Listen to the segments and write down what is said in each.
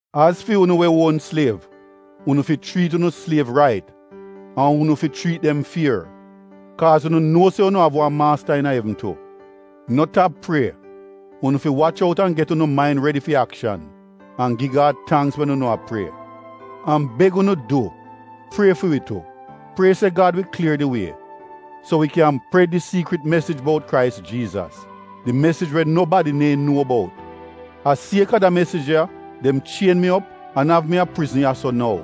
Az fi unu we uon sliev, unu fi chriit unu sliev rait an unu fi chriit dem fier. Kaaz unu nuo se unu av wan maasta iina evn tu. No tap prie. Unu fi wach out an get unu main redi fi akshan an gi Gad tangks wen unu a prie. An beg unu du, prie fi wi tu. Prie se Gad wi klier di wie, so wi kyan pred di siikrit mesij bout Krais Jiizas — di mesij we nobadi neehn nuo bout. A sieka da mesij ya dem chien mi op an av mi a prizn ya-so nou.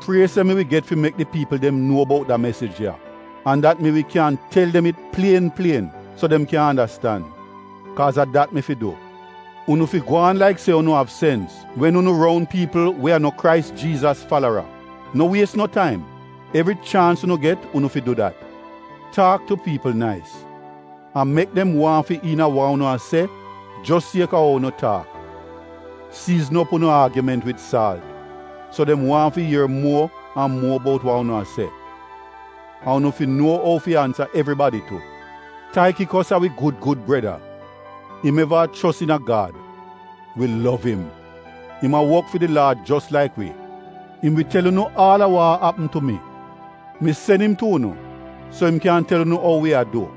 Prie se mi wi get fi mek di piipl dem nuo bout da mesij ya, an dat mi wi kyan tel dem it plien plien so dem kyan andastan. Kaaz a dat mi fi du. Unu fi gwaan laik se unu av sens wen unu roun piipl we a no Krais Jiizas falara. No wies no taim, evri chaans unu get unu fi du dat. Taak tu piipl nais, an mek dem waahn fi iina wa unu a se jos sieka ou unu taak. Siizn op unu aagiment wid saalt, so dem waahn fi ier muo an muo bout wa unu a se. An unu fi nuo ou fi ansa evribadi tu. Taikikos, a wi gud gud breda. Im eva a chos iina Gad. Wi lov im. Im a wok fi di Laad jos laik wi. Im wi tel unu aal a wa a apm tu mi. Mi sen im tu unu so im kyan tel unu ou wi a du,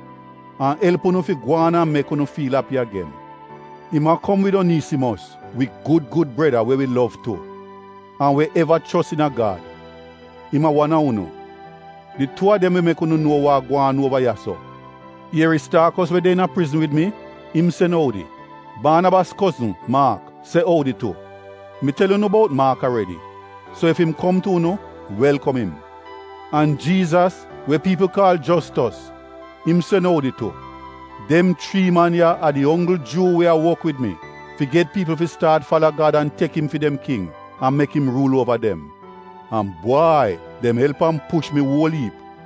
an elp push unu fi gwaan an mek unu fiil api agen. Im a kom wid Oniisimos wi gud gud breda we wi lov tu, an we eva chos iina Gad. Im a wan a unu. Di tuu a dem wi mek unu nuo wa a gwaan uova ya-so. Ieristaakos we de iina prizn wid mi, im sen oudi. Baanabas kozn, Maak, se oudi tu. Mi tel unu bout Maak aredi, so ef im kom tu unu, welkom im. An Jiizas, we piipl kaal Jostos, im sen oudi tu. Dem chrii man ya a di onggl Juu we a wok wid mi fi get piipl fi staat fala Gad an tek im fi dem king an mek im ruul uova dem. An bwai, dem elp an push mi uol iip.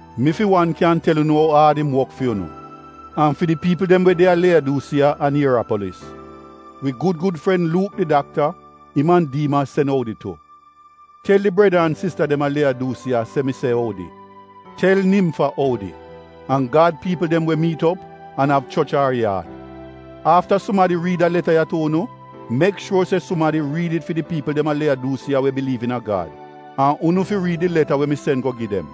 Mi fi wan kyan tel unu ou aad im wok fi unu an fi di piipl dem we a Leyadusiiya an Ierapolis. Wi gud gud fren Luuk, di dakta — im an Diimas sen oudi tu. Tel di breda an sista dem a Leyadusiiya se mi se oudi. Tel Nimfa oudi an Gad piipl dem we miit op an av choch a ar yaad. Afta sumadi riid da leta ya tu unu, mek shuor se sumadi riid it fi di piipl dem a Leyadusiiya we biliiv iina Gad. An unu fi riid di leta we mi sen go gi dem.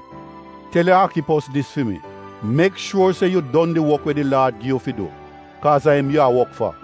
Tel Aakipos dis fi mi, “Mek shuor se yu don di wok we di Laad gi yu fi du, kaaz a im yaa wok fa.”